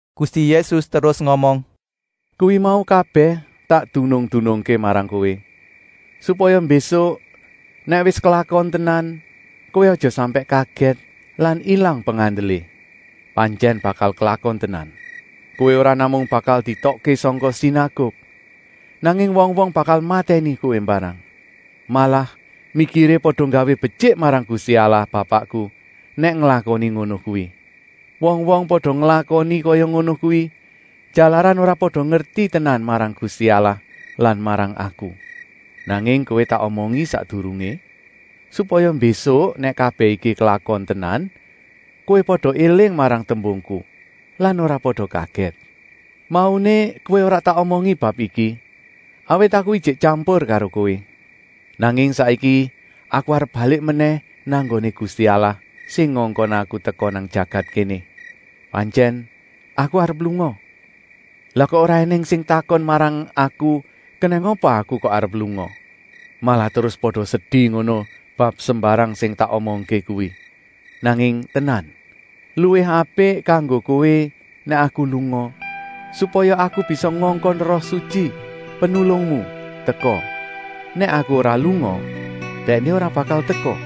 Gusti Yésus terus ngomong: “Kuwi mau kabèh tak dunung-dunungké marang kowé, supaya mbésuk nèk wis klakon tenan, kowé aja sampèk kagèt lan ilang pengandelé. Pantyèn bakal klakon tenan. Kowé ora namung bakal dietokké sangka sinaguk, nanging wong-wong bakal matèni kowé mbarang. Malah mikiré pada nggawé betyik marang Gusti Allah Bapakku nèk nglakoni ngono kuwi. Wong-wong pada nglakoni kaya ngono kuwi, jalaran ora pada ngerti tenan marang Gusti Allah lan marang Aku. Nanging kowé tak omongi sakdurungé, supaya mbésuk nèk kabèh iki klakon tenan kowé pada éling marang tembungku lan ora pada kagèt. “Mauné kowé ora tak omongi bab iki, awit Aku ijik tyampur karo kowé. Nanging saiki Aku arep balik menèh nang nggoné Gusti Allah sing ngongkon Aku teka nang jagat kéné. Pantyèn Aku arep lunga, lah kok ora ènèng sing takon marang Aku kenèng apa Aku kok arep lunga. Malah terus pada sedi ngono bab sembarang sing tak omongké kuwi. Nanging tenan, luwih apik kanggo kowé nèk Aku lunga, supaya Aku bisa ngongkon Roh Sutyi, Penulungmu, teka. Nèk Aku ora lunga, Dèkné ora bakal teka.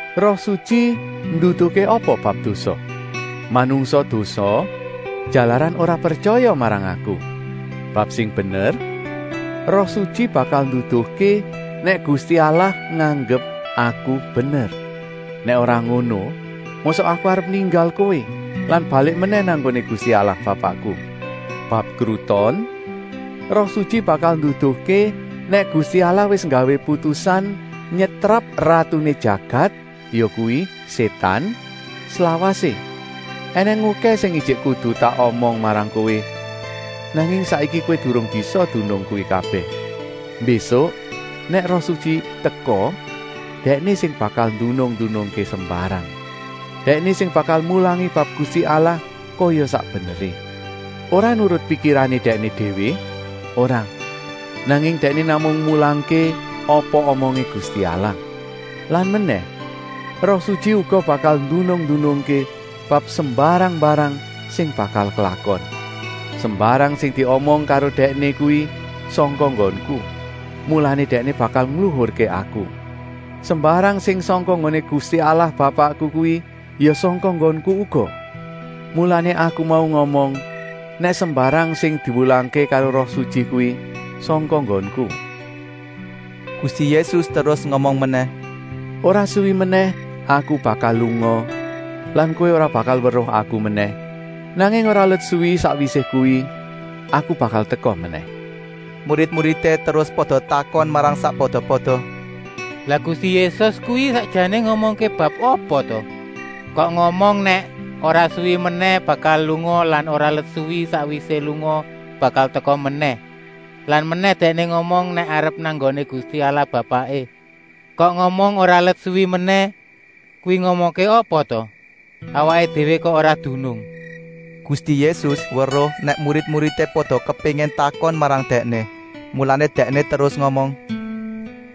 Roh Sutyi nduduhké apa bab dosa? Manungsa dosa, jalaran ora pretyaya marang Aku. Bab sing bener, Roh Sutyi bakal nduduhké nèk Gusti Allah nganggep Aku bener. Nèk ora ngono mosok Aku arep ninggal kowé lan balik menèh nang nggoné Gusti Allah Bapakku. Bab kruton, Roh Sutyi bakal nduduhké nèk Gusti Allah wis nggawé putusan nyetrap ratuné jagat, yakuwi Sétan, slawasé. “Enèng okèh sing ijik kudu tak omong marang kowé, nanging saiki kowé durung bisa dunung kuwi kabèh. Mbésuk nèk Roh Sutyi teka, Dèkné sing bakal ndunung-ndunungké sembarang. Dèkné sing bakal mulangi bab Gusti Allah kaya sak beneré; ora nurut pikirané Dèkné déwé, ora, nanging Dèkné namung mulangké apa omongé Gusti Allah. Lan menèh, Roh Sutyi uga bakal ndunung-ndunungké bab sembarang-mbarang sing bakal klakon. Sembarang sing diomong karo Dèkné kuwi sangka nggonku, mulané Dèkné bakal ngluhurké Aku. Sembarang sing sangka nggoné Gusti Allah Bapakku kuwi ya sangka nggonku uga. Mulané Aku mau ngomong nèk sembarang sing diwulangké karo Roh Sutyi kuwi sangka nggonku.” Gusti Yésus terus ngomong menèh: “Ora suwi menèh Aku bakal lunga lan kowé ora bakal weruh Aku menèh, nanging ora let suwi sakwisé kuwi Aku bakal teka menèh.” Murid-muridé terus pada takon marang sakpada-pada: “Lah Gusti Yésus kuwi sakjané ngomongké bab apa ta, kok ngomong nèk ora suwi menèh bakal lunga lan ora let suwi sakwisé lunga bakal teka menèh. Lan menèh, Dèkné ngomong nèk arep nang nggoné Gusti Allah Bapaké. Kok ngomong ora let suwi menèh? Kuwi ngomongké apa ta? Awaké déwé kok ora dunung!” Gusti Yésus weruh nèk murid-muridé pada kepéngin takon marang Dèkné, mulané Dèkné terus ngomong: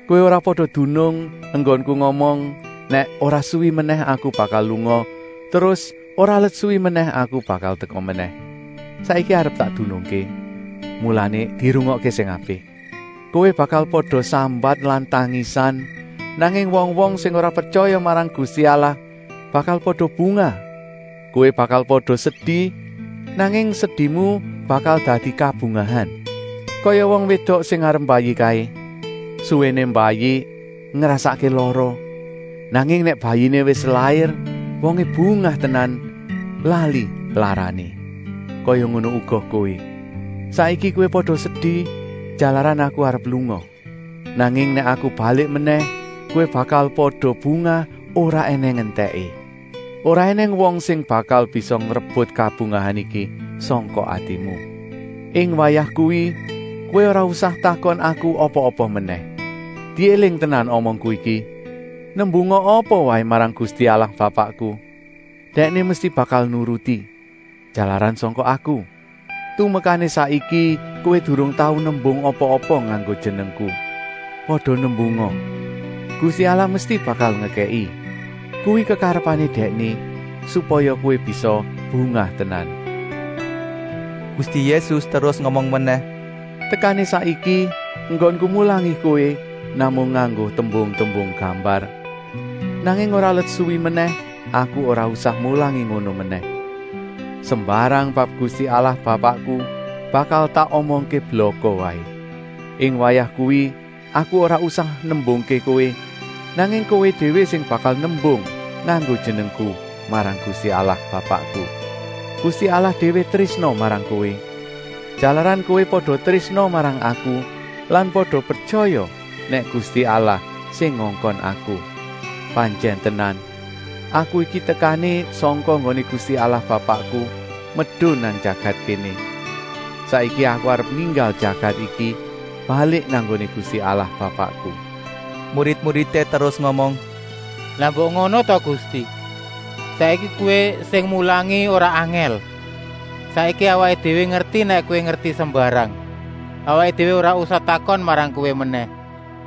“Kowé ora pada dunung enggonku ngomong nèk ora suwi menèh Aku bakal lunga terus ora let suwi menèh Aku bakal teka menèh. Saiki arep tak dunungké, mulané dirungokké sing apik. Kowé bakal pada sambat lan tangisan, nanging wong-wong sing ora pretyaya marang Gusti Allah bakal pada bungah. Kowé bakal pada sedi, nanging sedimu bakal dadi kabungahan. Kaya wong wédok sing arep mbayi kaé: suwéné mbayi ngrasakké lara, nanging nèk bayiné wis lair wongé bungah tenan, lali larané. Kaya ngono uga kowé. Saiki kowé pada sedi, jalaran Aku arep lunga. Nanging nèk Aku balik menèh kowé bakal pada bungah ora ènèng entèké. Ora ènèng wong sing bakal bisa ngrebut kabungahan iki sangka atimu. “Ing wayah kuwi kowé ora usah takon Aku apa-apa menèh. Diéling tenan omongku iki: nembunga apa waé marang Gusti Allah Bapakku, Dèkné mesti bakal nuruti, jalaran sangka Aku. Tumekané saiki kowé durung tau nembung apa-apa nganggo jenengku. Pada nembunga, Gusti Allah mesti bakal ngekèki. Kuwi kekarepané Dèkné, supaya kowé bisa bungah tenan.” Gusti Yésus terus ngomong menèh: “Tekané saiki enggonku mulangi kowé namung nganggo tembung-tembung gambar, nanging ora let suwi menèh Aku ora usah mulangi ngono menèh. Sembarang bab Gusti Allah Bapakku bakal tak omongké blaka waé. Ing wayah kuwi Aku ora usah nembungké kowé, nanging kowé déwé sing bakal nembung nganggo jenengku marang Gusti Allah Bapakku. Gusti Allah déwé trésna marang kowé, jalaran kowé pada trésna marang Aku lan pada pretyaya nèk Gusti Allah sing ngongkon Aku. Pantyèn tenan, Aku iki tekané sangka nggoné Gusti Allah Bapakku medun nang jagat kéné. Saiki Aku arep ninggal jagat iki balik nang nggoné Gusti Allah Bapakku.” Murid-muridé terus ngomong: “Lah mbok ngono ta Gusti! Saiki Kowé sing mulangi ora angèl. Saiki awaké déwé ngerti nèk Kowé ngerti sembarang. Awaké déwé ora usah takon marang Kowé menèh.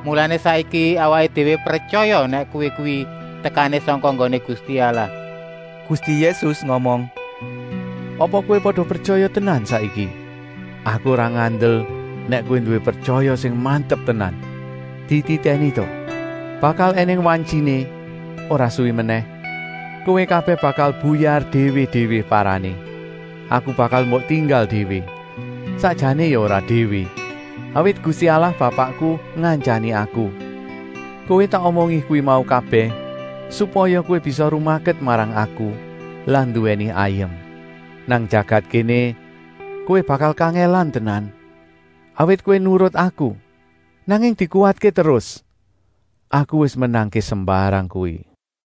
Mulané saiki awaké déwé pretyaya nèk Kowé kuwi tekané sangka nggoné Gusti Allah.” Gusti Yésus ngomong: “Apa kowé pada pretyaya tenan saiki? Aku ora ngandel nèk kowé nduwé pretyaya sing mantep tenan. Dititèni ta! Bakal ènèng wantyiné, ora suwi menèh, kowé kabèh bakal buyar déwé-déwé parané. Aku bakal mbok tinggal déwé. Sakjané ya ora déwé, awit Gusti Allah Bapakku ngantyani Aku. Kowé tak omongi kuwi mau kabèh supaya kowé bisa rumaket marang Aku lan nduwèni ayem. Nang jagat kéné kowé bakal kangèlan tenan, awit kowé nurut Aku, nanging dikuwatké terus, Aku wis menangké sembarang kuwi.”